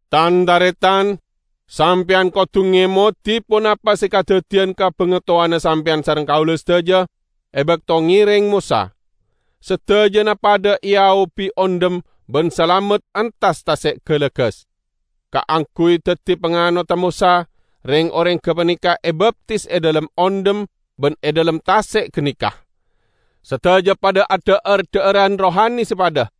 Tan-taretan! Sampeyan kodu ngemodi ponapa se kadaddiyan ka bangatowana sampeyan sareng kaula sadaja e bakto ngereng Mosa. Sadajana padha eaobi ondhem ban salamet entas Tase' Galagas. Kaangguy daddi panganodda Mosa, reng-oreng gapaneka ebaptis e dhalem ondhem ban e dhalem tase' ganeka. Sadaja padha adha'ar dha'aran rohani se padha,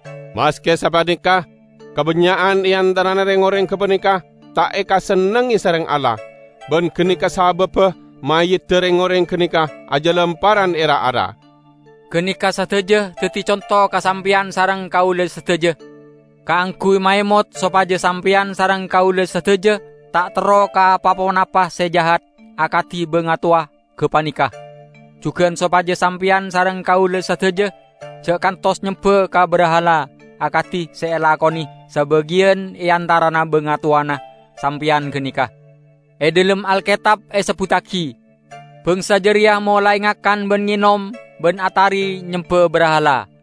Maske sapaneka kabannya'an e antarana reng-oreng gapaneka ta' ekasennengnge sareng Allah, ban ganeka sababba mayyidda reng-oreng ganeka ajalamperran e ra-ara. Ganeka sadaja daddi conto ka sampeyan sareng kaula sadaja, kaangguy maemot sopaja sampeyan sareng kaula sadaja ta' terro ka pa-ponapa se jahat akadi bangatowa gapaneka. Jugan sopaja sampeyan sareng kaula sadaja ja' kantos nyemba ka brahala akadi se elakone sabagiyan e antarana bangatowana sampeyan ganeka. E dhalem Alketab esebbuttagi, "Bangsa jareya molae ngakan ban ngenom, ban atari nyemba brahala."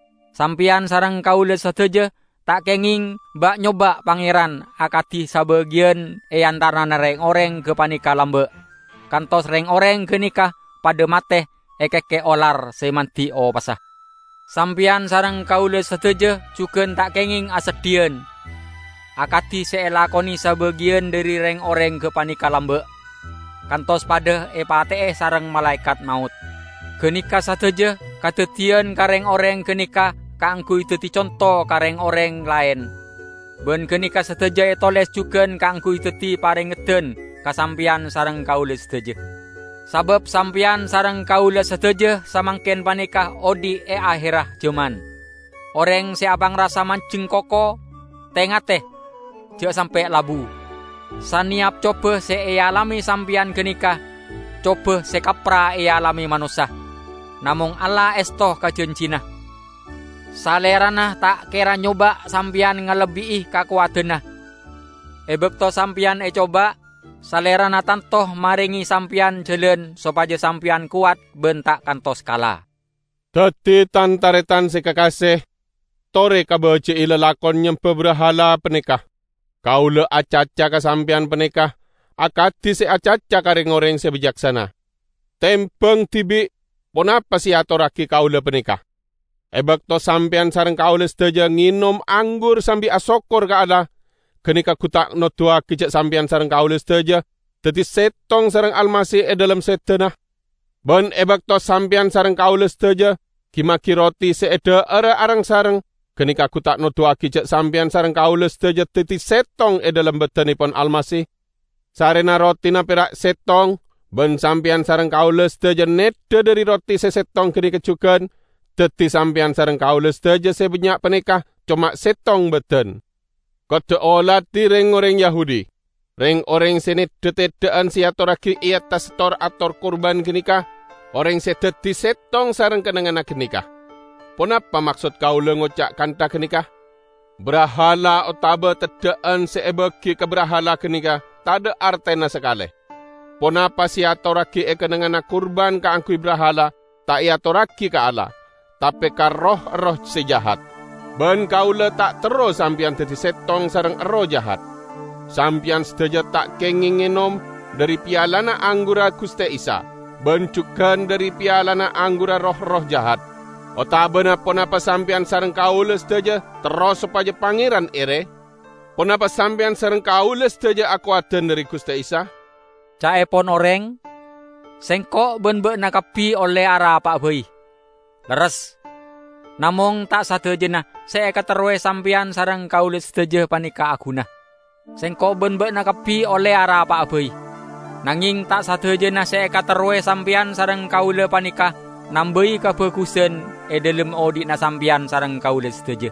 Sampeyan sareng kaula sadaja ta' kengeng ba'-nyoba' Pangeran akadi sabagiyan e antarana reng-oreng gapaneka lamba', kantos reng-oreng ganeka padha mate ekekke' olar se mandi opassa. Sampeyan sareng kaula sadaja jugan ta' kengeng aseddhiyan; akadi se elakone sabagiyan dhari reng-oreng gapaneka lamba', kantos padha epate'e sareng Malaekat Maot. Ganeka sadaja kadaddiyan ka reng-oreng ganeka kaangguy daddi conto ka reng-oreng laen. Ban ganeka sadaja etoles jugan kaangguy daddi parengeddan ka sampeyan sareng kaula sadaja. Sabab sampeyan sareng kaula sadaja samangken paneka odhi' e aherra jaman. Oreng se apangrasa manjeng koko, te-ngate; ja' sampe' labu. Saneyap coba se ealame sampeyan ganeka coba se kappra ealame manossa. Namong Allah esto ka janjina. Salerana ta' kera nyoba' sampeyan ngalebbi'i kakowadanna. E bakto sampeyan ecoba, Salerana tanto marenge sampeyan jalan sopaja sampeyan kowat ban ta' kantos kala. Daddi, tan-taretan se kakase, tore kabaji'i lalakon nyemba brahala paneka. Kaula acaca ka sampeyan paneka akadi se acaca ka reng-oreng se bicaksana. Tembang dibi' ponapa se eatorragi kaula paneka. E bakto sampeyan sareng kaula sadaja ngenom anggur sambi asokkor ka Allah, ganeka gu ta' noduwagi ja' sampeyan sareng kaula sadaja daddi settong sareng Almasih e dhalem sedana? Ban e bakto sampeyan sareng kaula sadaja gi-magi roti se edha'ara areng-sareng, ganeka gu ta' noduwagi ja' sampeyan sareng kaula sadaja daddi settong e dhalem badannepon Almasih? Sarrena rotina pera' settong, ban sampeyan sareng kaula sadaja neddha dhari roti se settong ganeka jugan, daddi sampeyan sareng kaula sadaja se bannya' paneka coma settong badan. Kodda' oladi reng-oreng Yahudi. Reng-oreng se neddha teddha'an se eatorragi e attas tor-ator kurban ganeka oreng se daddi settong sareng kennengngan ganeka. Ponapa maksod kaula ngoca' kantha ganeka? Brahala otaba teddha'an se ebagi ka brahala ganeka tadha' artena sakale. Ponapa se eatorragi e kennengnganna kurban kaangguy brahala ta' eatorragi ka Allah, tape ka roh-erroh se jahat. Ban kaula ta' terro sampeyan daddi settong sareng erroh jahat. Sampeyan sadaja ta' kengeng ngenom dhari pialana anggurra Guste Isa, ban jugan dhari pialana anggurra roh-erroh jahat. Otabana ponapa sampeyan sareng kaula sadaja terro sopaja Pangeran ere? Ponapa sampeyan sareng kaula sadaja akowadan dhari Guste Isa? Ca'epon oreng, "Sengko' ban ba'na kabbi olle arapa'a bai." Lerres! Namong ta' sadajana se ekaterrowe sampeyan sareng kaula sadaja paneka aguna. "Sengko' ban ba'na kabbi olle arapa'a bai" -- nangeng ta' sadajana se ekaterrowe sampeyan sareng kaula paneka nambai kabagusan e dhalem odhi'na sampeyan sareng kaula sadaja.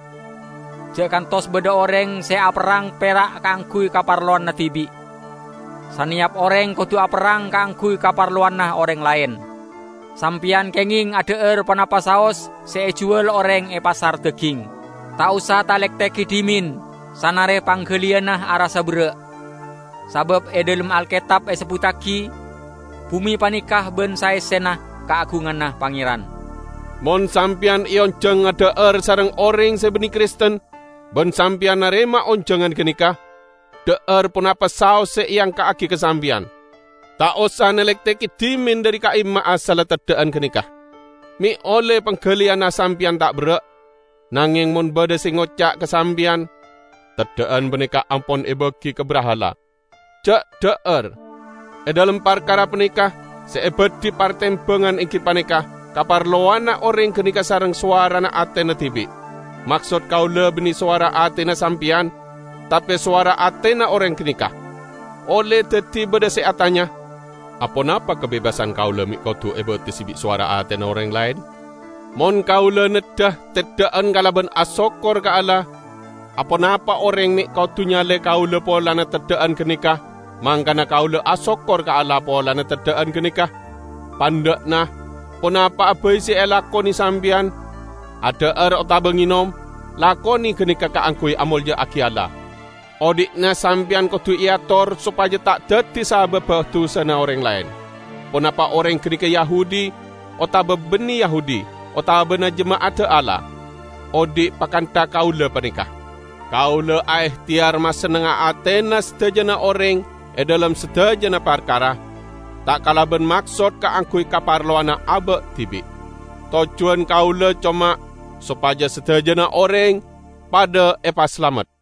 Ja' kantos badha oreng se aperrang pera' kaangguy kaparlowanna dibi'. Saneyap oreng kodu aperrang kaangguy kaparlowanna oreng laen. Sampeyan kengeng adha'ar ponapa saos se ejuwal oreng e pasar daging. Ta' osa talektegi dhimen, sanare panggaliyanna arassa berra'. Sabab e dhalem Alketab esebbuttagi, "Bume paneka ban saessena kaagunganna Pangeran." Mon sampeyan eonjang adha'ar sareng oreng se banne Kristen, ban sampeyan narema onjangan ganeka, dha'ar ponapa saos se eangka'agi ka sampeyan. Ta' osa nalektegi dhimen dhari ka'imma asalla teddha'an ganeka, me' olle panggaliyanna sampeyan ta' berra'. Nangeng mon badha se ngoca' ka sampeyan, "Teddha'an paneka ampon ebagi ka brahala," ja' dha'ar; e dhalem parkara paneka se ebadhi partembangan enggi paneka kaparlowanna oreng ganeka sareng sowarana atena dibi' Maksod kaula banne sowara atena sampeyan, tape sowara atena oreng ganeka. Olle daddi badha se atanya, "Aponapa kabebasan kaula me' kodu ebatesse bi' sowara atena oreng laen? Mon kaula neddha teddha'an kalaban asokkor ka Allah, aponapa oreng me' kodu nyale kaula polana teddha'an ganeka, mangkana kaula asokkor ka Allah polana teddha'an ganeka?" Pandha'na, ponapa'a bai se elakone sampeyan -- adha'ar otaba ngenom -- lakone ganeka kaangguy amolja'agi Allah. Odhi'na sampeyan kodu eator sopaja ta' daddi sababba dusana oreng laen; ponapa oreng ganeka Yahudi otaba banne Yahudi, otabana jema'adda Allah. Odhi' pakantha kaula paneka. Kaula aehteyar masennengnga atena sadajana oreng e dhalem sadajana parkara, ta' kalaban maksod kaangguy kaparlowanna aba' dibi'. Tojjuwan kaula coma sopaja sadajana oreng padha epasalamet.